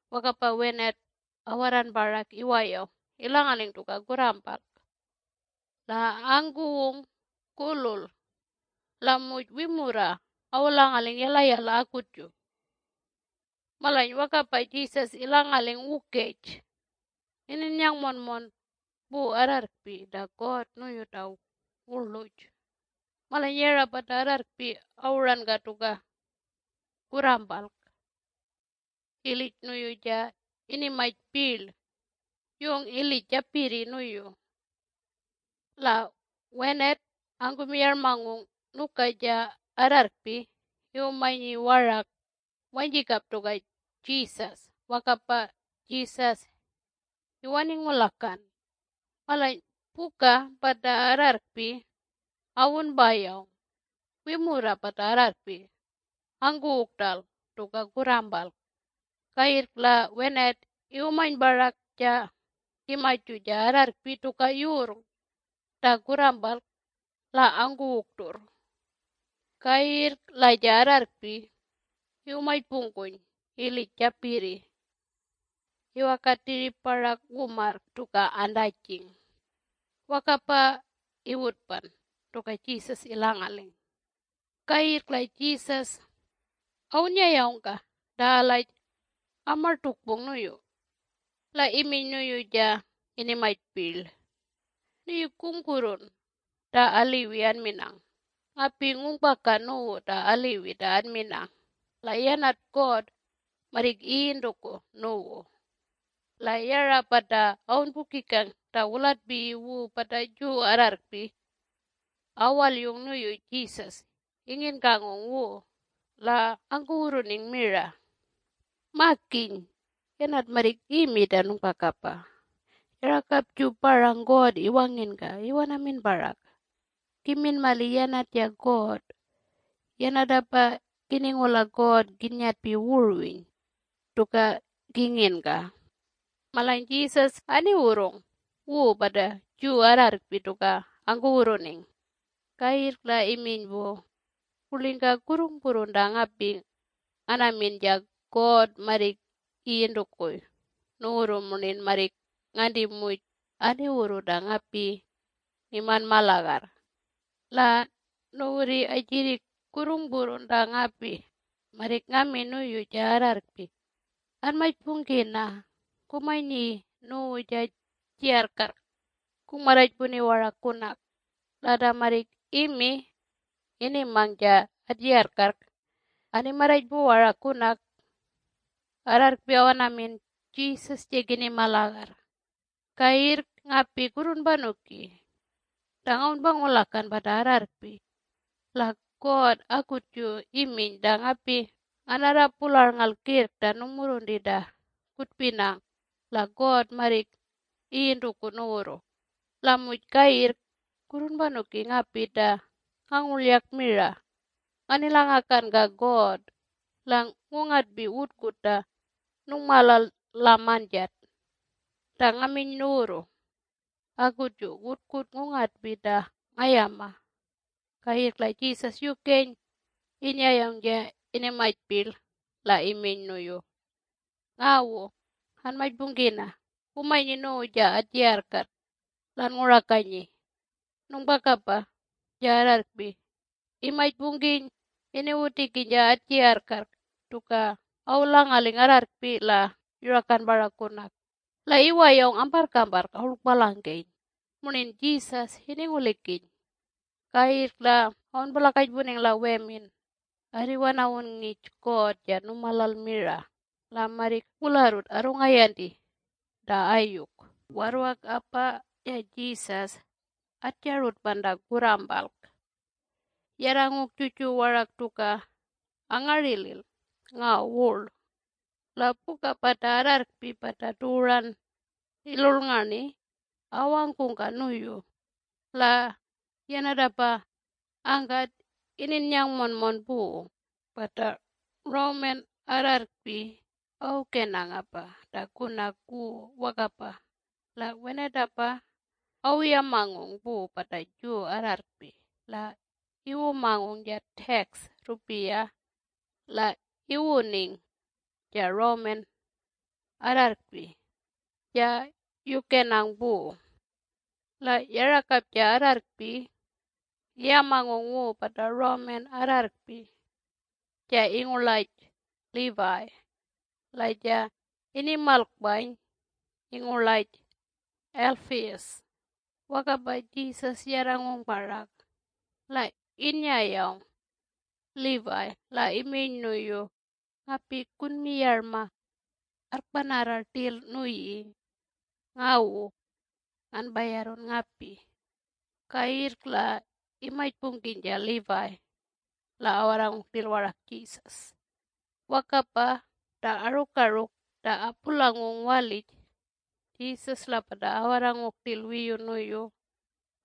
Wakapa wenat awarran parak iwayawng ilangaling tuka kurrampalk la angkuwung kulul la muj wimurra awulangaling yalayala akutju. Malany wakapa Jesus ilangaling wukej, ininnyang monmon pu arrarrkpi ta God nuyu ta wurluj. Malany yara pata arrarrkpi awuranka tuka kurrampalk ilij nuyu ja inimany pirl yung ilij japirri nuyu. La wenat angkumiyarmangung nuka ja arrarrkpi iwumanyi warak wanyjikap tuka Jesus wakapa Jesus iwaningulakan. Malany puka pata arrarrkpi awunpayawng wimurra pata arrarrkpi angkuwung rtal tuka kurrampalk. Kayirrk la wenat iwumany parak ja kimaju ja arrarrkpi tuka yurrng ta kurrampalk la angkuwung rturr. Kayirrk la ja arrarrkpi iwumajpungkuny ilij japirri iwakan tiyip parak wumarrk tuka antajing. Wakapa iwutpan tuka Jesus ilangaling. Kayirrk la Jesus awunnyayawngka ta alaj amartukpung nuyu la iminy nuyu ja inimany pirl, “Nuyi kungpurrun ta aliwi anminang. Ngapi ngungpaka nuwu ta aliwi ta anminang la yanat God marrik iyintukuy nuwu. La yara pata awunpukikang ta wulatpiyi wu pata Jew arrarrkpi awalyung nuyu Jesus inginkangung wu la angkuwurruning mira, “Makiny, yanat marrik imi ta nungpakapa! Yarakapju parang God iwanginka iwanamin parak! Kimin mali yanat ja God. Yanatapa kiningula God kinyetpi wurwiny tuka kinginka!” Malany Jesus aniwurrung wu pata Jew arrarrkpi tuka angkuwurruning, kayirrk la iminy pu, “Kurlingka kurrungpurrun ta ngapi nganamin ja God marrik iyintukuy nuwurru murnin marrik nganti muj aniwurru ta ngapi ngimanma lagarr. La nuwurri ajirrik kurrungpurrun ta ngapi marrik ngami nuyu ja arrarrkpi ‘Anmajpungkina, kumanyi nuwu ja atjiyarrkarrk kungmarrajpuni warak kunak!’ la ta marrik imi inimang ja atjiyarrkarrk animarrajpu warak kunak arrarrkpi awanamin ‘Jesus ja kinima lagarr’. Kayirrk ngapi kurrunpanuki ta ngawunpangulakan pata arrarrkpi la God akutju iminy ta ngapi nganarra pularnngalk kirrk ta nungmurrunti ta kutpinang la God marrik iyintukuy nuwurru. La muj kayirrk kurrunpaniki ngapi ta ngangurlyak mira nganilangakanka God la ngungatpi wutkut ta nungmalal la manjat ta ngaminy nuwurru. Akutju wutkut ngungatpi ta ngayama!” Kayirrk la Jesus yukeny innyayawng ja inimany pirl la iminy nuyu, “Ngawu, anmajpungkina kumanyi nuwu ja atjiyarrkarrk la anngurakanyi!” Nungpakapa ja arrarrkpi imajpungkiny iniwutikiny ja atjiyarrkarrk tuka awulangaling arrarrkpi la yurakan parak kunak. La iwayawng amparrkamparrk awurlkpalangkeny murnin Jesus iningulikiny. Kayirrk la awunpulakajpuning la wemin, “Arriwanawun ngij God ja numalal mira. La marrik wularrut arrungayanti ta ayuk!” Warrwakapa ja Jesus atjarutpan ta kurrampalk yarrangung juju warak tuka angarilil ngaw wurl. La puka pata arrarrkpi pata tuwuran ilurrngarni awangkungka nuyu, la yanatapa angkat ininnyang monmon pu. Pata Roman arrarrkpi awukenangapa ta kunak wu wakapa la wenatapa awuyamangung pu pata Jew arrarrkpi la iwumangung ja tax rrupiya la inimangung ja Roman arrarrkpi ja yukenang pu. La yarakap ja arrarrkpi iyamangung wu pata Roman arrarrkpi ja ingurlaj Levi, la ja inimalkpany ingurlaj Alphaeus. Wakapa Jesus yarrangung parak la innyayawng Levi la iminy nuyu, “Ngapi kunmiyarma arrkpanarra rtil nuyi. Ngawu, nganpayarrun ngapi!” Kayirrk la imajpungkiny ja Levi la awarrangung rtil warak Jesus. Wakapa ta arukaruk ta apulangung walij, Jesus la pata awarrangung rtil wiyu nuyu,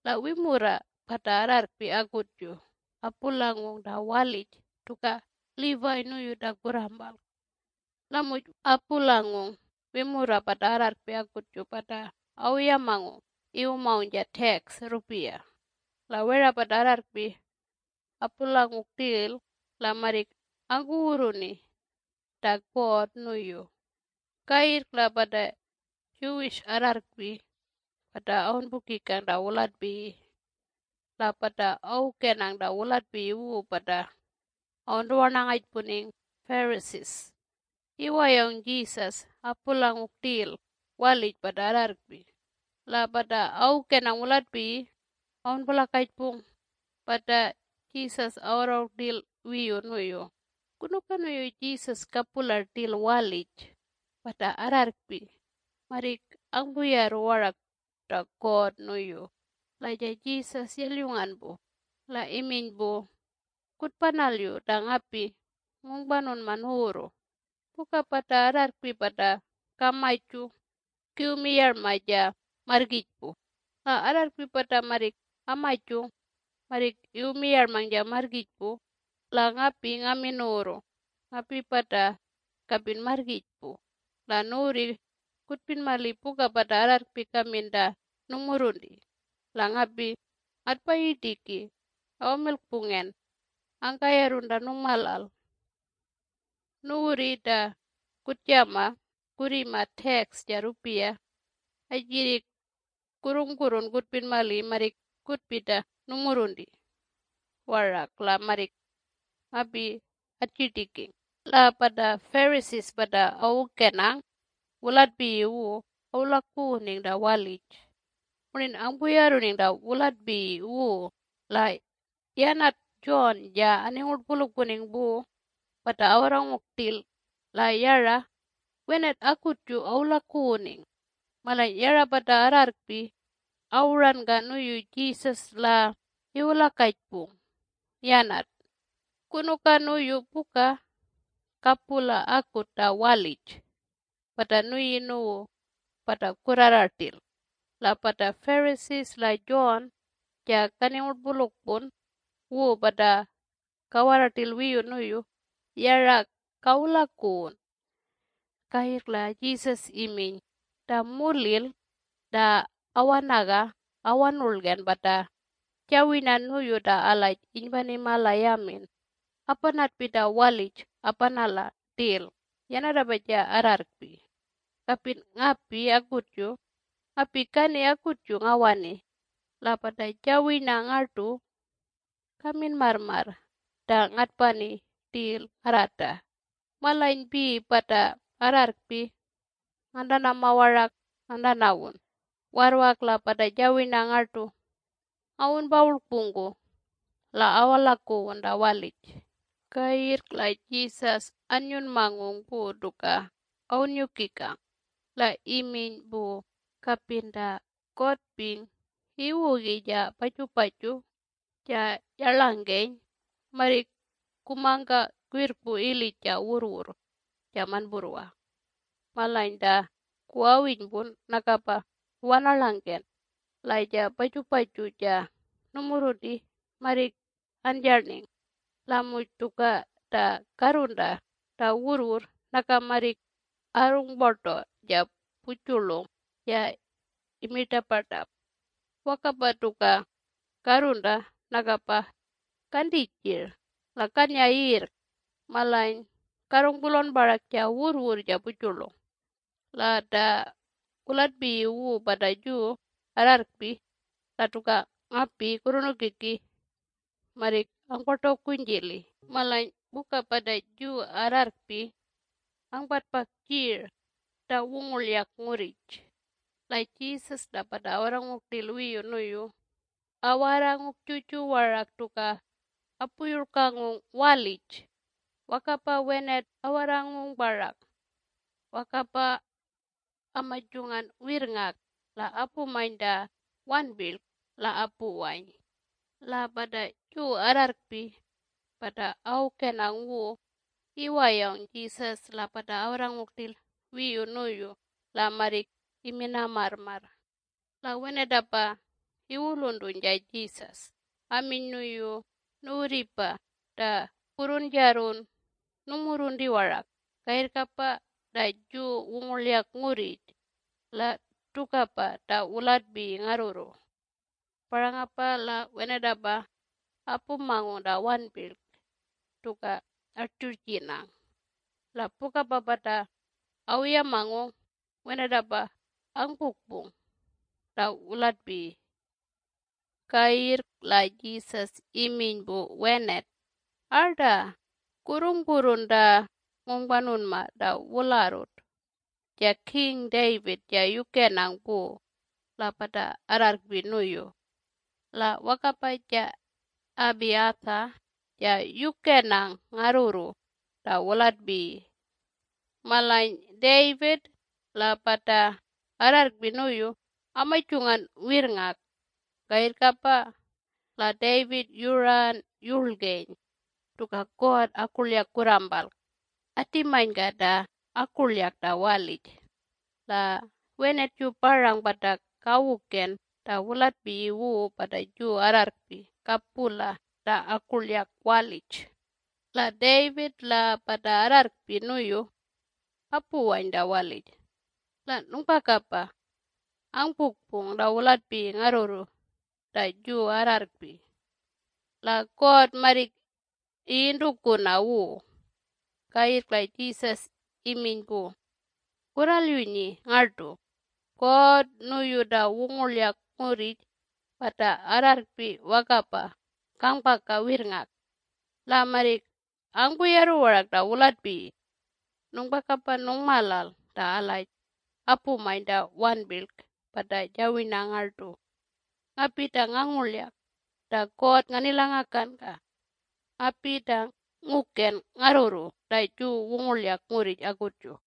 la wimurra pata arrarrkpi akutju, apulangung ta walij tuka Levi nuyu ta kurrampalk la muj apulangung wimurra pata arrarrkpi akutju pata awuyamangung iwumangung ja tax rrupiya, la wera pata arrarrkpi apulangung rtil la marrik angkuwurruni ta God nuyu. Kayirrk la pata Jew arrarrkpi pata awunpukikang ta wulatpiyi, la pata awukenang ta wulatpiyi wu pata awuntuwarnangajpuning Pharisees, iwayawng Jesus apulangung rtil walij pata arrarrkpi. La pata awukenang wulatpiyi awunpulakajpung pata Jesus awarrangung rtil wiyu nuyu, “Kunuka nuyu Jesus kapula rtil walij pata arrarrkpi marrik angpuyarru warak ta God nuyu?” La ja Jesus yalyungan pu, la iminy pu, “Kutpanalyu ta ngapi ngungpanunma nuwurru - puka pata arrarrkpi pata kamaju kiwumiyarma ja marrgijpu, la arrarrkpi pata marrik amajung marrik iwumiyarmang ja marrgijpu. La ngapi ngamin nuwurru ngapipa ta kapin marrgijpu. La nuwurrri kutpin mali puka pata arrarrkpi kamin ta nungmurrunti, la ngapi ngatpayirtiki awamilkpungen angkayarrun ta nungmalal. Nuwurri ta kutjama kurrima tax ja rrupiya atjirrik kurrungpurrun kutpin mali marrik kutpi ta nungmurrunti warak la marrik ngapi atjirtiking!” La pata Pharisee pata awukenang wulatpiyi wu awulakuwuning ta walij murnin angpuyarruning ta wulatpiyi wu la yanat John ja aningurtpulukpuning pu pata awarrangung rtil la yara wenat akutju awulakuwuning. Malany yara pata arrarrkpi awuranka nuyu Jesus la iwulakajpung yanat, “Kunuka nuyu puka kapula akut ta walij pata nuyi nuwu pata kurrara rtil la pata Pharisees la John ja kaningurtpulukpun wu pata kawarra rtil wiyu nuyu yara kawulakuwun?” Kayirrk la Jesus iminy “Ta mulil ta awanaga awanurlgen pata jawirna nuyu ta alaj inypanima la yamin apanatpi ta walij apanala rtil yanatapa ja arrarrkpi. Kapin ngapi akutju. Ngapi kani akutju ngawani la pata jawirna ngartu kamin marrmarr ta ngatpani rtil ngarrata. Malanypi pata arrarrkpi ngantanama warak ngantanawun warrwak la pata jawirna ngartu ngawunpawurlkpungku la awalakuwun ta walij.” Kayirrk la Jesus annyunmangung pu tuka awunnyukikang. La iminy pu, “Kapin ta kotping iwugi ja pajupaju ja yarlangke marrik kumangka kwirrkpu ilij ja wurrwurr ja manpurrwa. Malany ta kuwawinypun nakapa iwanarlangken la ja pajupaju ja numurrunti marrik anjarning. La muj tuka ta karrunta ta wurrwurr naka marrik arrungpu rlaw ja pujurlung ja imi rtapartap. Wakapa tuka karrunta nakapa kanti jir la kanya yirrk! Malany karrungpulawn parak ja wurrwurr ja pujurlung. La ta wulatpiyi wu pata Jew arrarrkpi la tuka ngapi kurrunukiki marrik angpartawkunyjili.” Malany puka pata Jew arrarrkpi angpatpang jirl ta wungurlyak ngurrij, la Jesus la pata awarrangung rtil wiyu nuyu awarrangung juju warak tuka apuyurlkangung walij. Wakapa wenat awarrangung parak wakapa amajungan wirrngak la apumany ta wanpirlk la apuwany. La pata Jew arrarrkpi pata awukenang wu iwayawng Jesus la pata awarrangung rtil wiyu nuyu la marrik amina marrmarr. La wenatapa iwuluntuny ja Jesus aminy nuyu, “Nuwurripa ta kurrunjarrun nungmurrunti warak! Kayirrkapa ta Jew wungurlyak ngurrij la tukapa ta wulatpiyi ngarrurru. Parangapa la wenatapa apumangung ta wanpirlk tuka atjurjinang. La pukapa pata awuyamangung! Wenatapa angpukpung ta wulatpiyi!” Kayirrk la Jesus iminy pu wenat, “Arta! Kurrungpurrun ta ngungpanunma ta wularrut ja King David ja yukenang pu la pata arrarrkpi nuyu. La wakapa ja Abiathar ja yukenang ngarrurru ta wulatpiyi. Malany David la pata arrarrkpi nuyu amajungan wirrngak, kayirrkapa la David yuran yurlgeny tuka God akurlyak kurrampalk atimanyka ta akurlyak ta walij. La wenatju parang pata kawuken ta wulatpiyi wu pata Jew arrarrkpi kapula ta akurlyak walij. La David la pata arrarrkpi nuyu apuwany ta walij, la nungpakapa angpukpung ta wulatpiyi ngarrurru ta Jew arrarrkpi! La God marrik iyintukuna wu.” Kayirrk la Jesus iminy pu, “Kurralyunyi ngartu! God nuyu ta wungurlyak ngurrij pata arrarrkpi wakapa kangpaka wirrngak, la marrik angpuyarru warak ta wulatpiyi! Nungpakapa nungmalal ta alaj apumany ta wanpirlk pata jawirna ngartu, ngapi ta ngangurlyak ta God nganilangakanka. Ngapi ta nguken ngarrurru ta Jew wungurlyak ngurrij akutju!”